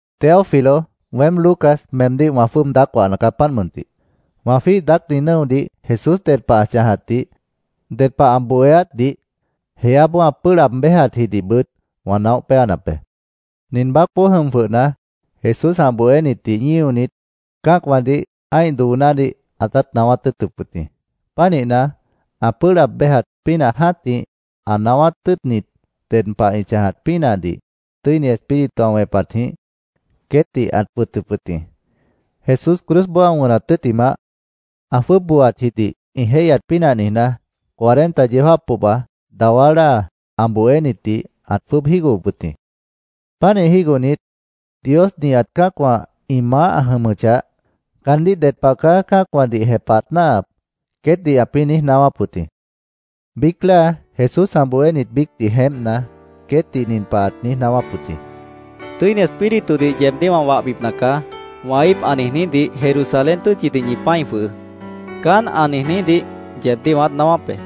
Teófilo, weém, Lucas, meemdíh wã jwʉ́ʉb daác wahna caá, páant mʉntih. Wã jwíih daácni nʉ́odih Jesús ded pah ã chãjatdih, ded pah ã bohéátdih, jeáboó ã pʉ́ʉh laab béjatjidihbʉt wã naóh péanap be. Nin baácboó jʉm jwʉhna, Jesús ã bohénitdih ñíonit, cã́acwãdih ã́ih doonádih ãtát naáwát tʉ́ʉtʉp wʉt jĩ. Pánihna, ã pʉ́ʉh laab béjat pínah jã́tih, ã naáwát tʉ́ʉtnit ded pah ĩ chãjat pínahdih Tʉ́ini Espíritu ã wẽpatjĩh queétdih ãt wʉtʉp wʉt jĩ. Jesús cruzboó ã wʉnat tʉ́ttimah, ã jwʉ́ʉb booatjidih ĩ jéihyat pínah niijná, cuarenta yeó jáap pohba, dawá láa ã bohénitdih ãt jwʉ́ʉb jígohop wʉt jĩ. Pánih jígohnit, “Dios nihat cã́acwã ĩ maáh ã jʉmʉchah, caandíh ded pah caá cã́acwãdih jepahat náahap”, queétdih ãpĩ́ niíj naáwáp wʉt jĩ. Biíc láa Jesús ã bohénit biícdih jeémpna, queétdih nin pah ãt niíj naáwáp wʉt jĩ: —‘Tʉ́ini Espíritudih yeebdíh wã wahbipna caá’, wã íip ã niijnídih Jerusalén tʉ́tchidih ñi pã́i jwʉhʉʉ́. Caán ã niijnídih yeebdíh wãát naáwáp be.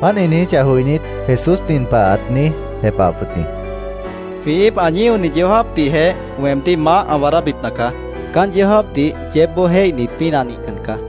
Páant ĩ niijíchah joinít, Jesús nin pah ãt niíj jepahap wʉt jĩ: —Jwĩ íip ã ñíoni yeó jáapdihjeh weemdíh maáh ã waadábipna caá. Caán yeó jáapdih yeébboó jéihnit pínah nihcan caá.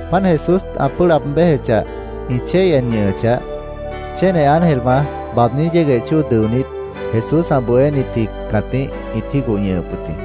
Páant Jesús ã pʉ́ʉh laab béjechah, ĩ chéi en ñʉʉn ñʉ́hʉchah, chéne ángelwã baabní yégueh dʉonít Jesús ã bohénitji cãtíh ĩt jígoh ñʉhʉp wʉt jĩ.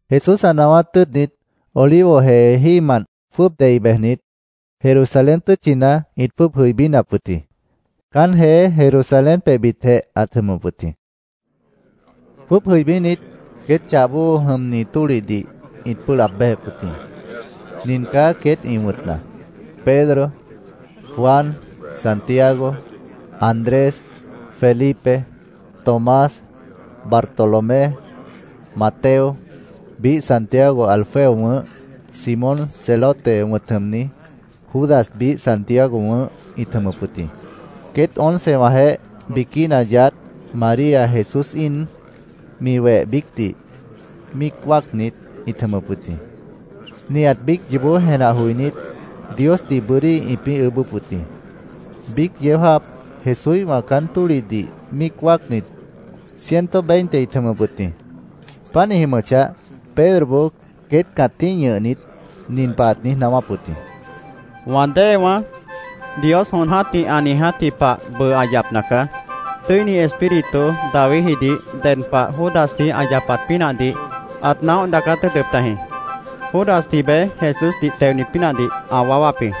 Jesús ã naáwát tʉ́ʉtnit Olivo jee jímant jwʉ́ʉb dei bejnit, Jerusalén tʉ́tchina ĩt jwʉ́ʉb jʉibínap wʉt jĩ. Caán jeé Jerusalén pebhbitjeh ãt jʉmʉp wʉt jĩ. Jwʉ́ʉb jʉibínit, queét chahboó ĩ jʉmni tólihdih ĩt pʉ́ʉh laab béjep wʉt jĩ. Nin caá queét ĩ wʉ̃tna: Pedro, Juan, Santiago, Andrés, Felipe, Tomás, Bartolomé, Mateo, biíh Santiago Alfeo wʉ̃ʉ́h, Simón Celote wʉ̃t jʉmni, Judas biíh Santiago wʉ̃ʉ́h ĩt jʉmʉp wʉt jĩ. Queét oncewãjeéh, biquína yaádh, María Jesús íin, mi weh biícdih, míic wáacnit, ĩt jʉmʉp wʉt jĩ. Nihat biíc yoobó jenah joinít, Diosdih bʉ́dí ĩpĩ́ ʉʉ́bʉ́p wʉt jĩ. Biíc yeó jáap Jesúíhwã caán tólihdih míic wáacnit, ciento y veinte ĩt jʉmʉp wʉt jĩ. Páant ĩ jʉmʉchah, Pedroboó queét cãtíh ñʉhnit, nin pah ãt niíj naáwáp wʉt jĩ: “Wã déewãá, Dios jon jã́tih ã niijátji pah bʉʉ ã yapna caá. Tʉ́ini Espíritu Davidjidih ded pah Judasji ã yapat pínahdih ãt naóh daacát tʉ́ʉtʉp tajĩ. Judasji beé Jesúsdih teonit pínahdih ã waáwáp jĩ.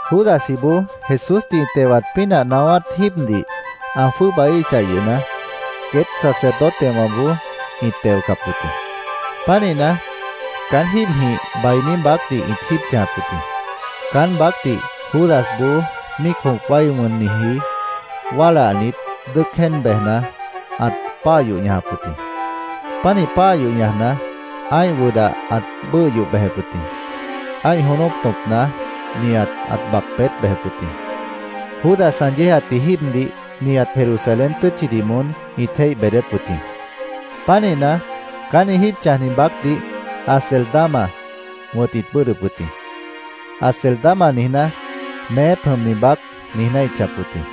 Judasjiboó Jesúsdih ĩ tewat pínah naáwát jíibdih ã jwʉ́ʉbaíhichah yʉhna, queét sacerdotewãboó ĩt teocap wʉt jĩ. Pánihna, caán jíibjĩh bainí baácdih ĩt jíib chãjap wʉt jĩ. Caán baácdih Judasboó míic jõp wái wʉnniji wálahnit, dʉ́ʉc jéen bejna, ãt páah yoh ñajap wʉt jĩ. Pánih páah yoh ñajna, ã́ih wʉdah ãt bʉ́ʉh yoh bejep wʉt jĩ. Ã́ih jónóp tõpna nihat ãt bac peét bejep wʉt jĩ. Judas ã yéejatji jíibdih nihat Jerusalén tʉ́tchidih moón ĩt jéih beedép wʉt jĩ. Pánihna, caán ĩ jíib chãjni baácdih Acéldama wʉ̃t ĩt bʉ́ʉdhdʉp wʉt jĩ. “Acéldama”, niijná, “Meép jʉmni baác”, niijná ĩt chãjap wʉt jĩ.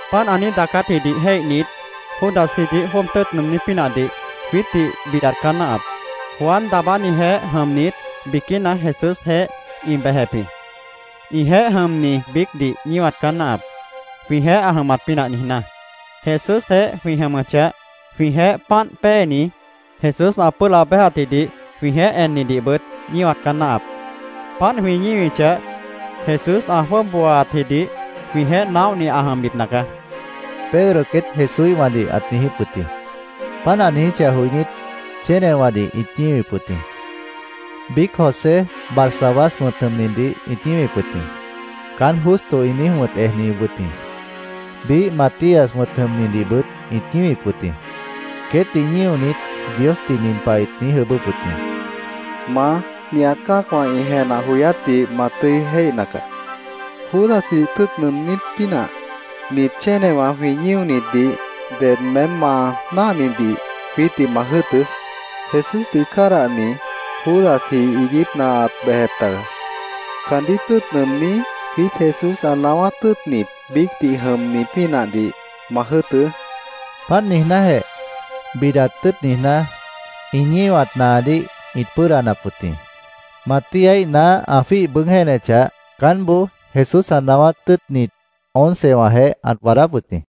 “Páant ã niíj daacátjidih jéihnit, Judasjidih jwʉ́ʉb tʉ́ʉt nʉʉmní pínahdih jwiítdih bidat caá náahap. Juan Daabánijeéh jʉmnit biquína Jesúsjeéh ĩ bejep jĩ. Ĩjeéh jʉmni biícdih ñíwat caá náahap, jwĩjeéh ã jʉmat pínah niijná. Jesúsjeéh jwĩ jʉmʉchah, jwĩjeéh páant péeni, Jesús ã pʉ́ʉh laab béjatjidih jwĩjeéh ennidihbʉt ñíwat caá náahap. Páant jwĩ ñíwichah, Jesús ã jwʉ́ʉb booatjidih jwĩjeéh naóhni ã jʉmbipna caá”, Pedro queét Jesúíhwãdih ãt niijíp wʉt jĩ. Páant ã niijíchah joinít, chénewãdih ĩt ñíwip wʉt jĩ. Biíc José Barsabás wʉ̃t jʉmnidih ĩt ñíwip wʉt jĩ. Caán Justo ĩ niíj wʉ̃t ejni wʉt jĩ. Biíh Matías wʉ̃t jʉmnidihbʉt ĩt ñíwip wʉt jĩ. Queétdih ñíonit, Diosdih nin pah ĩt niíj ʉʉ́bʉ́p wʉt jĩ: “Maá, nihat cã́acwã ĩ jenah joyátdih ma tʉ́i jéihna caá. Judasjidih tʉ́ʉt nʉʉmní pínah, nit chénewã jwĩ ñíonitdih, ded meém ma náahnidih jwiítdih ma jʉ́ʉtʉ́. Jesúsdih cádahni Judasji iiguípna ãt bejep taga. Caandíh tʉ́ʉt nʉʉmní, jwiít Jesús ã naáwát tʉ́ʉtnit biícdih jʉmni pínahdih ma jʉ́ʉtʉ́”, Diosdih ĩt niijíp wʉt jĩ. Páant niijnájeh, bidat tʉ́ʉt niijná, ĩ ñíwat naanádih ĩt pʉ́ʉdanap wʉt jĩ. Matíaíh naá ã jwíih bʉʉ́g jéenechah, caánboó Jesús ã naáwát tʉ́ʉtnit oncewãjeéh ãt waadáp wʉt jĩ.